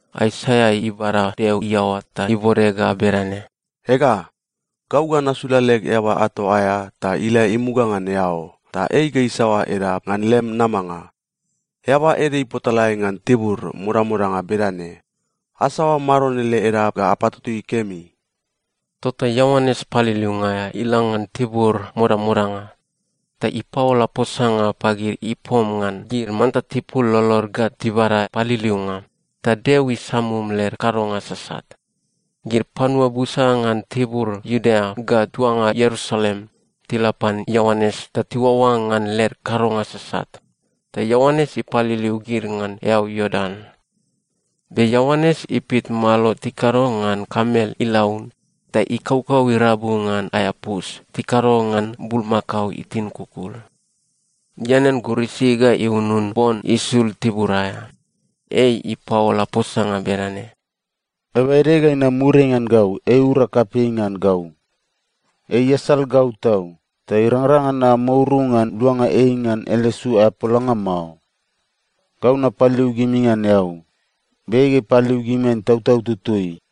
Aisaia ibada Deo iaoa ta ibode ga bedane, “Ega, gau ga nasula leg eaba ato aea ta ila imuga ngan eao. Ta ei ga isaoa edap ngan lem namanga.” “Eaba ede ipotalae ngan tibur modamodanga bedane, ‘Asaoa Maron ele edap ga apatutui kemi!’” Tota Ioanes Paliliunga aea ila ngan tibur modamodanga, ta ipaola posanga pagid ipom ngan gid manta tipul lolod ga tibada paliliunga, ta Deo isamum led kadonga sasat. Gid panua busa ngan tibur Iudea ga tuanga Ierusalem tila pan Ioanes ta tiuaoa ngan led kadonga sasat, ta Ioanes ipaliliu gid ngan eau Iordan. Be Ioanes ipit malo tikado ngan kamel ilaun ta ikaukau irabu ngan aea pus tikado ngan bulmakao itin kukul. Ianean gurisi ga iunun bon isul tibur aea. Ei ipaola posanga bedane, “Eaba ede ga inam muriai ngan gau, ei iura kapei ngan gau. Ei iasal gau tau, ta irangrang ngan namouru ngan luanga ei ngan ele su aea polanga mao. Gau napaliliu gimi ngan eau, be ei ga ipaliliu gimi ngan Itautau Tutui.”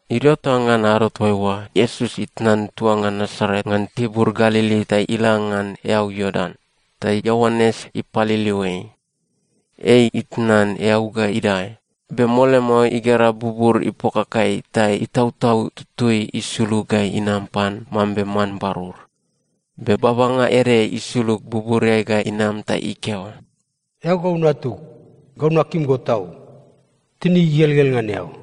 Idio ta ngan ado toaiua, Iesus itnan tuanga Nasaret ngan tibur Galili ta ila ngan eau Iordan, ta Ioanes ipaliliu ei. Ei itnan eau ga idae, be mole mao igera bubur ipokakai ta Itautau Tutui isulug ga inam pan mambe man barur. Be babanga ede isulug buburiai ga inam ta ikeo, “Eao gau Natug. Gau nakim go tau. Tinig igelgel ngan eao.”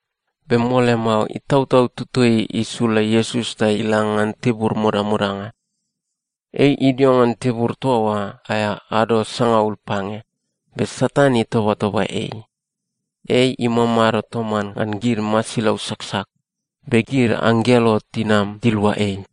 Be mole mao, Itautau Tutui isula Iesus ta ila ngan tibur modamodanga. Ei idio ngan tibur toa oa aea ado sangaul pange, be Satan itobatoba ei. Ei imamado toman ngan gid masilau saksak, be gid anggelo tinam tilua ei.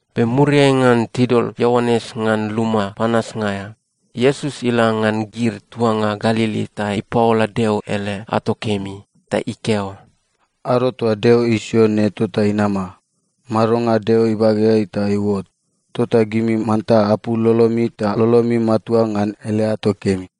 Be muriai ngan tidol Ioanes ngan luma panasnga aea, Iesus ila ngan gid tuanga Galili ta ipaola Deo ele ato kemi. Ta ikeo, “Ado toa Deo isio ne tota inama. Madonga Deo ibageai ta iuot. Tota gimi manta apul lolomi ta lolomi matua ngan ele ato kemi!”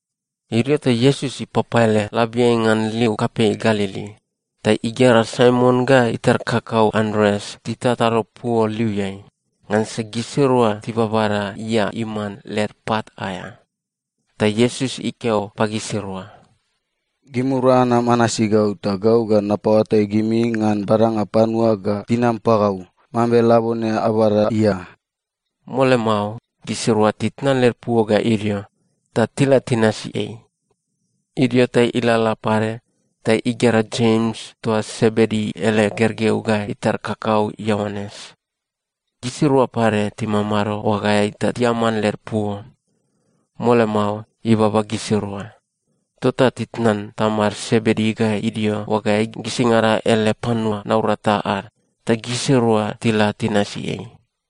Idio ta Iesus ipapaele labiai ngan liu kapei Galili, ta igera Saimon ga itar kakau Andreas titatado puo liuiai, ngansa gisirua tibabada ia iman led pat aea. Ta Iesus ikeo pagisirua, “Gimirua anam anasi gau, ta gau ga napaoatai gimi ngan badanga panua ga tinam pagau, mambe labone ababada ia.” Mole mao, gisirua titnan led puo ga idio, ta tila tinasi ei. Idio ta ilalala pade ta igera Jems toa Sebedi ele gergeu ga itar kakau Ioanes. Gisirua pade timamado oagaeai ta tiaman led puo. Mole mao, ibaba gisirua. Tota titnan tamad Sebedi ga idio oagaeai gisingada ele panua naurata ad, ta gisirua tila tinasi ei.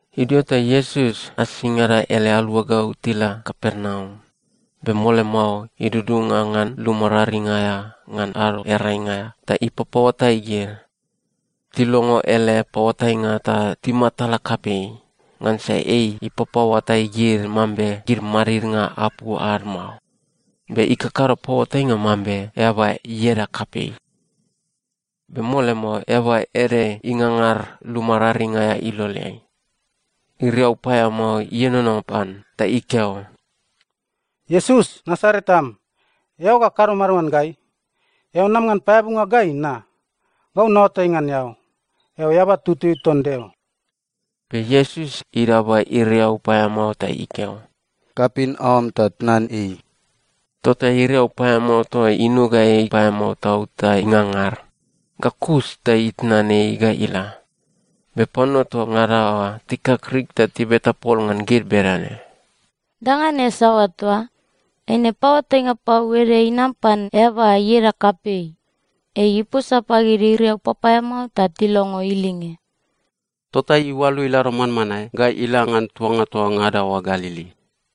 Idio ta Iesus asingada ele aluagau tila Kapernaum. Be mole mao idudunga ngan luma raring aea ngan Ado Earainga aea ta ipapaoatai gid. Tilongo ele paoatainga ta timatala kapei, ngansa ei ipapaoatai gid mambe gid madidnga apu ad mao, be ikakado paoatainga mambe eaba ieda kapei. Be mole mao, eaba ede ingangar luma raring aea iloleai. Iriau paeamao ienono pan ta ikeo, “Iesus, Nasaret am, eao ga kado mado ngan gai? Eao nam ngan paeabunga gai na? Gau naoatai ngan eao. Eao Eaba Tutui ton Deo.” Be Iesus idaba iriau paeamao ta ikeo, “Kapin aoam ta tnan ei.” Tota iriau paeamao toa oa inuga ei paeamao tau ta ingangar, ga kus ta itnan ei ga ila. Be panua toa ngada oa tikakrik ta tibeta pol ngan gid bedane, “Danga ne saoa toa? Eine paoatainga pau ede inam pan eaba ieda kapei! Ei iposa pagid iriau papaeamao ta tilongo ilinge.” Tota iualu ilado manmanae ga ila ngan tuanga toa ngada oa Galili.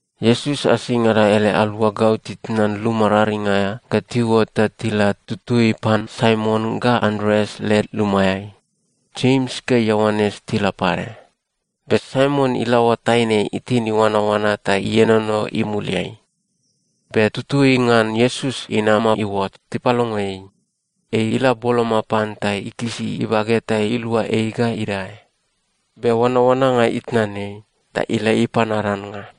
Iesus asingada ele aluagau titnan luma raring aea ga tiuot ta tila tutui pan Saimon ga Andreas led lumaeai. Jems ga Ioanes tila pade. Be Saimon ilaoa taine itin iuanaoana ta ienono imuliai. Be tutui ngan Iesus inama iuot, tipalongo ei. Ei ila boloma pan ta ikisi ibage ta ilua ei ga idae. Be oanaoananga itnan ei, ta ila ipan ad annga.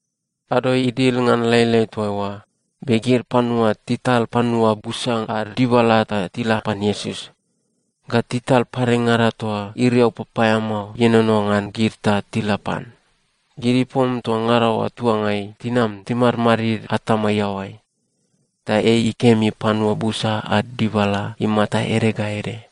Ado idil ngan lailai toaiua, be gid panua tital panua busa ad dibala ta tila pan Iesus. Ga tital padengada toa iriau papaeamao ienono ngan gid ta tila pan. Gid ipom toa ngada oa tuangai tinam timadmadid atama iaoai. Ta ei ikemi panua busa ad dibala imata ede ga ede,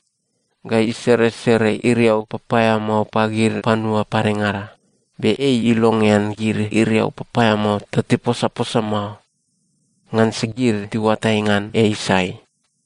ga iseresere iriau papaeamao pagid panua padengada. Be ei ilongean gid iriau papaeamao ta tiposaposa mao, ngansa gid tiuatai ngan ei sai.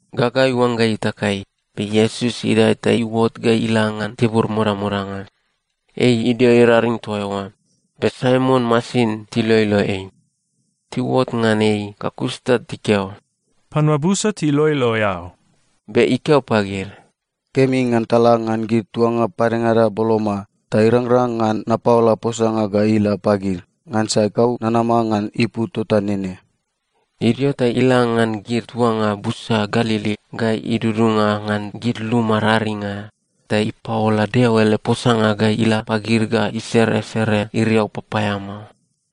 Gaga iuangga itakai, be Iesus idae ta iuot ga ila ngan tibur modamodanga. Ei idio iraring toa eoa. Be Saimon masin tiloilo ei. Tiuot ngan ei ga kus ta tikeo, “Panua busa tiloilo eao.” Be ikeo pagid, “Kemi ngan tala ngan gid tuanga padengada boloma, ta irangrang ngan napaola posanga ga ila pagid. Ngansa gau nanama ngan ipu tota nene.” Idio ta ila ngan gid tuanga busa Galili ga idudunga ngan gid luma raring aea, ta ipaola Deo ele posanga ga ila pagid ga iseresere iriau papaeamao.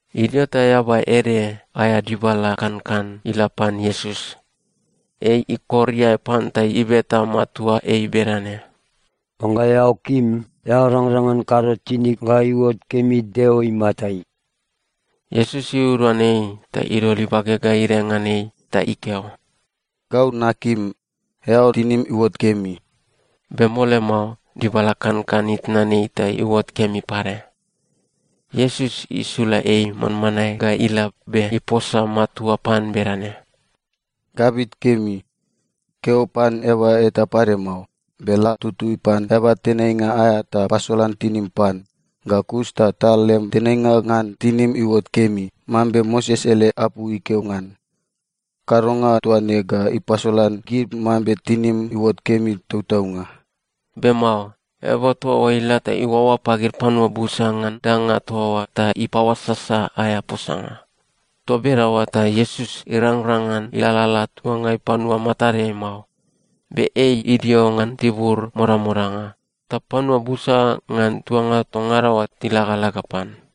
Idio ta eaba ede aea dibala kankan ila pan Iesus. Ei ikor iae pan ta ibeta matua ei bedane, “Oangga eao kim, eao rangrang ngan kado tinig ga iuot kemi Deo imatai.” Iesus iuduan ei ta idol ibage ga idae ngan ei ta ikeo, “Gau nakim. Eao tinim iuot kemi.” Be mole mao, dibala kankan itnan ei ta iuot kemi pade. Iesus isula ei manmanae ga ila be iposa matua pan bedane, “Gabit kemi. Keo pan eaba eta pade mao. Be la tutui pan eaba tenainga aea ta pasolan tinim pan. Ga kus ta tal lem tenainga ngan tinim iuot kemi, mambe Moses ele apu ikeo ngan. Kadonga toa ne ga ipasolan gid mambe tinim iuot kemi tautaunga.” Be mao. Eaba toa oa ila ta iuaoa pagid panua busa ngan danga toa oa ta ipaoasasa aea posanga. Toa bedaoa ta Iesus irangrang ngan ilalala tuangai panua matadeai mao. Be ei idio ngan tibur modamodanga, ta panua busa ngan tuanga toa ngada oa tilagalaga pan.